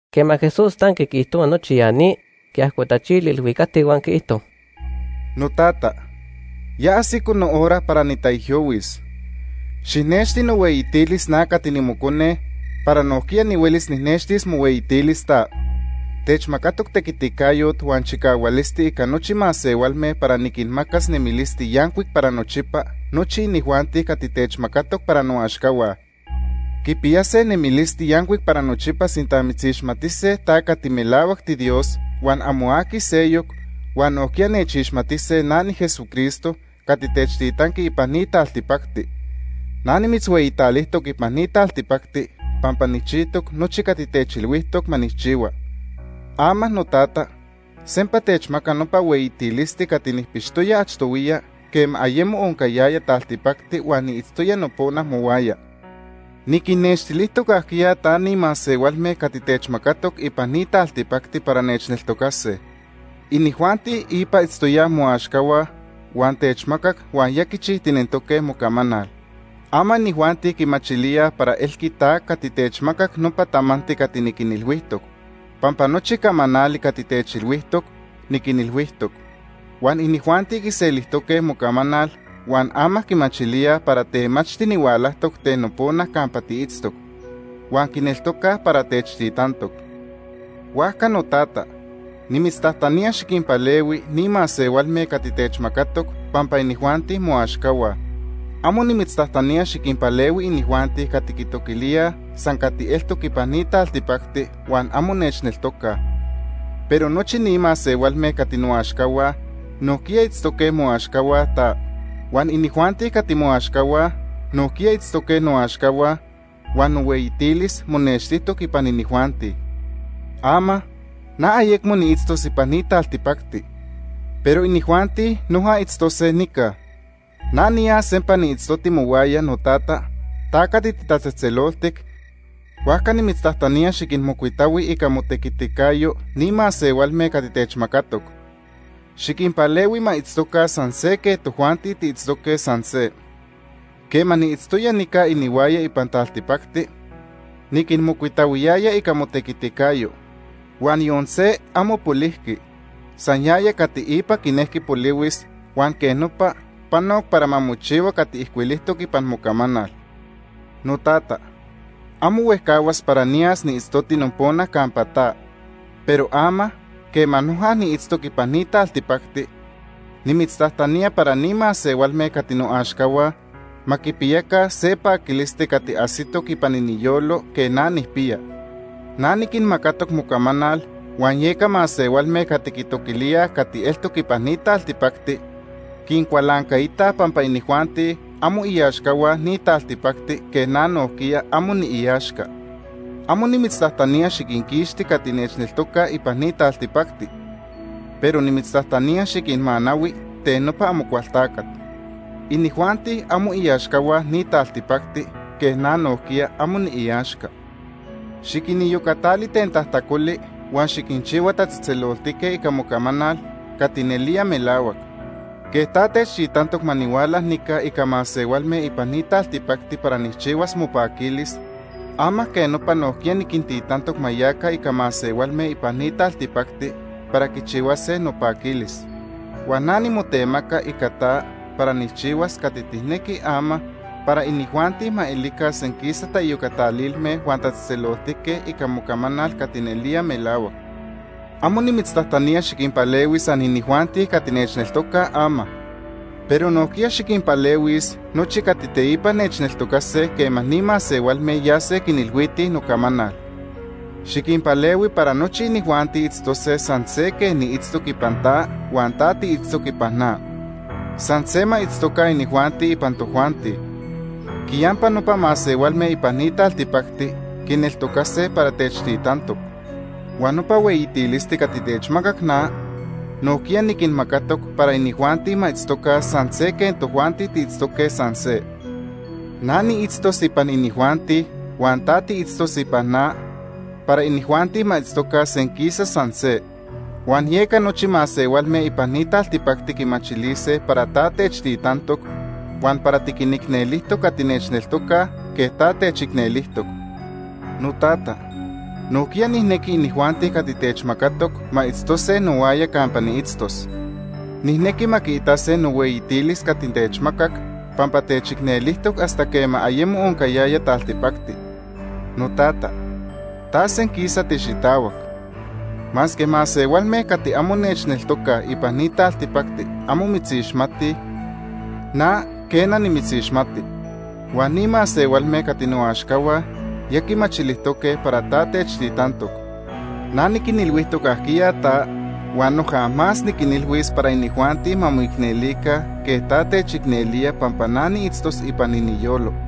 Quema Jesús tanqui quiijtohua nochi ya ni, quiajcotachili ilhuicacti huan quiijto: “Notata, ya ajsico nohora para nitaijyohuis. Xijnexti nohueyitilis, na cati nimocone, para nojquiya nihuelis nijnextilis mohueyitilis ta. Techmacatoc tequiticayot huan chicahualisti ica nochi masehualme para niquinmacas nemilisti yancuic para nochipa nochi inijuanti cati techmacatoc para noaxcahua. Quipiyase nemilisti yancuic para nochipa sinta mitzixmatise ta cati melahuac tiDios huan amo aqui seyoc, huan nojquiya nechixmatise na niJesucristo cati techtitanqui ipan ni taltipacti. “Na nimitzhueyitalijtoc ipan ni taltipacti pampa nijchijtoc nochi cati techilhuijtoc ma nijchihua. Ama, Notata, sempa techmaca nopa hueyitilisti cati nijpixtoya achtohuiya quema ayemo oncayaya taltipacti huan niitztoya nopona mohuaya. “Niquinnextilijtoc ajquiya ta ni masehualme cati techmacatoc ipan ni taltipacti para nechneltocase. Inijuanti ipa itztoyaj moaxcahua huan techmacac huan ya quichijtinentoque mocamanal. Ama inijuanti quimachilíaj para elqui ta cati techmacac nopa tamanti cati niquinilhuijtoc, pampa nochi camanali cati techilhuijtoc, niquinilhuijtoc. Huan inijuanti quiselijtoque mocamanal huan ama quimachilíaj para temachti nihualajtoc ten nopona campa tiitztoc. Huan quineltocaj para techtitantoc. “Huajca, Notata, nimitztajtanía xiquinpalehui ni masehualme cati techmacatoc pampa inijuanti moaxcahua. Amo nimitztajtanía xiquinpalehui inijuanti cati quitoquilíaj san cati eltoc ipan ni taltipacti huan amo nechneltocaj. Pero nochi ni masehualme cati noaxcahua nojquiya itztoque moaxcahua ta. Huan inijuanti cati moaxcahua nojquiya itztoque noaxcahua huan nohueyitilis monextijtoc ipan inijuanti. “Ama, na ayecmo niitztos ipan ni taltipacti, pero inijuanti noja itztose nica. Na niyas sempa niitztoti mohuaya, Notata, ta cati titatzejtzeloltic, huajca nimitztajtanía xiquinmocuitahui ica motequiticayo ni masehualme cati techmacatoc. Xiquinpalehui ma itztoca san se quej tojuanti tiitztoque san se. Quema niitztoya nica inihuaya ipan taltipacti, niquinmocuitahuiyaya ica motequiticayo. Huan yon se amo polijqui, san yaya cati ipa quinejqui polihuis, huan quej nopa panoc para ma mochihua cati ijcuilijtoc ipan mocamanal. “Notata, amo huejcahuas para niyas niitztoti nopona campa ta, pero ama, quema noja niitztoc ipan ni taltipacti, nimitztajtanía para ni masehualme cati noaxcahua ma quipiyaca se paquilisti cati ajsitoc ipan iniyolo quej na nijpiya. Na niquinmacatoc mocamanal huan yeca masehualme cati quitoquilíaj cati eltoc ipan ni taltipacti, quincualancaitaj pampa inijuanti amo iaxcahua ni taltipacti quej na nojquiya amo niiaxca. Amo nimitztajtanía xiquinquixti cati nechneltocaj ipan ni taltipacti, pero nimitztajtanía xiquinmanahui ten nopa Amocualtacat. Inijuanti amo iaxcahua ni taltipacti quej na nojquiya amo niiaxca. Xiquiniyocatali ten tajtacoli huan xiquinchihua tatzejtzeloltique ica mocamanal cati nelía melahuac. Quej ta techtitantoc ma nihuala nica ica masehualme ipan ni taltipacti para nijchihuas mopaquilis, ama quej nopa nojquiya niquintitantoc ma yaca ica masehualme ipan ni taltipacti para quichihuase nopaquilis. Huan na nimotemaca ica ta para nijchihuas cati tijnequi ama, para inijuanti ma elica senquisa taiyocatalilme huan tatzejtzeloltique ica mocamanal cati nelía melahuac. “Amo nimitztajtanía xiquinpalehui san inijuanti cati nechneltocaj ama, pero nojquiya xiquinpalehuis nochi cati teipa nechneltocase quema ni masehualme yase quinilhuitij nocamanal. Xiquinpalehui para nochi inijuanti itztose san se quej niitztoc ipan ta huan ta tiitztoc ipan na. San se ma itztoca inijuanti ipan tojuanti. Quiyampa nopa masehualme ipan ni taltipacti quineltocase para techtitantoc. Huan nopa hueyitilisti cati techmacac na, nojquiya niquinmacatoc para inijuanti ma itztoca san se quej tojuanti tiitztoque san se. Na niitztos ipan inijuanti huan ta tiitztos ipan na para inijuanti ma itztoca senquisa san se. Huan yeca nochi masehualme ipan ni taltipacti quimachilise para ta techtitantoc, huan para tiquinicnelijtoc cati nechneltocaj quej ta techicnelijtoc. “Notata, nojquiya nijnequi inijuanti cati techmacatoc ma itztose nohuaya campa niitztos. Nijnequi ma quiitase nohueyitilis cati techmacac pampa techicnelijtoc hasta quema ayemo oncayaya taltipacti. Notata, ta senquisa tixitahuac. Masque masehualme cati amo nechneltocaj ipan ni taltipacti amo mitzixmatij, na quena, nimitzixmati. Huan ni masehualme cati noaxcahua ya quimachilijtoque para ta techtitantoc. Na niquinilhuijtoc ajquiya ta huan noja más niquinilhuis para inijuanti ma moicnelica quej ta techicnelía pampa na niitztos ipan iniyolo.”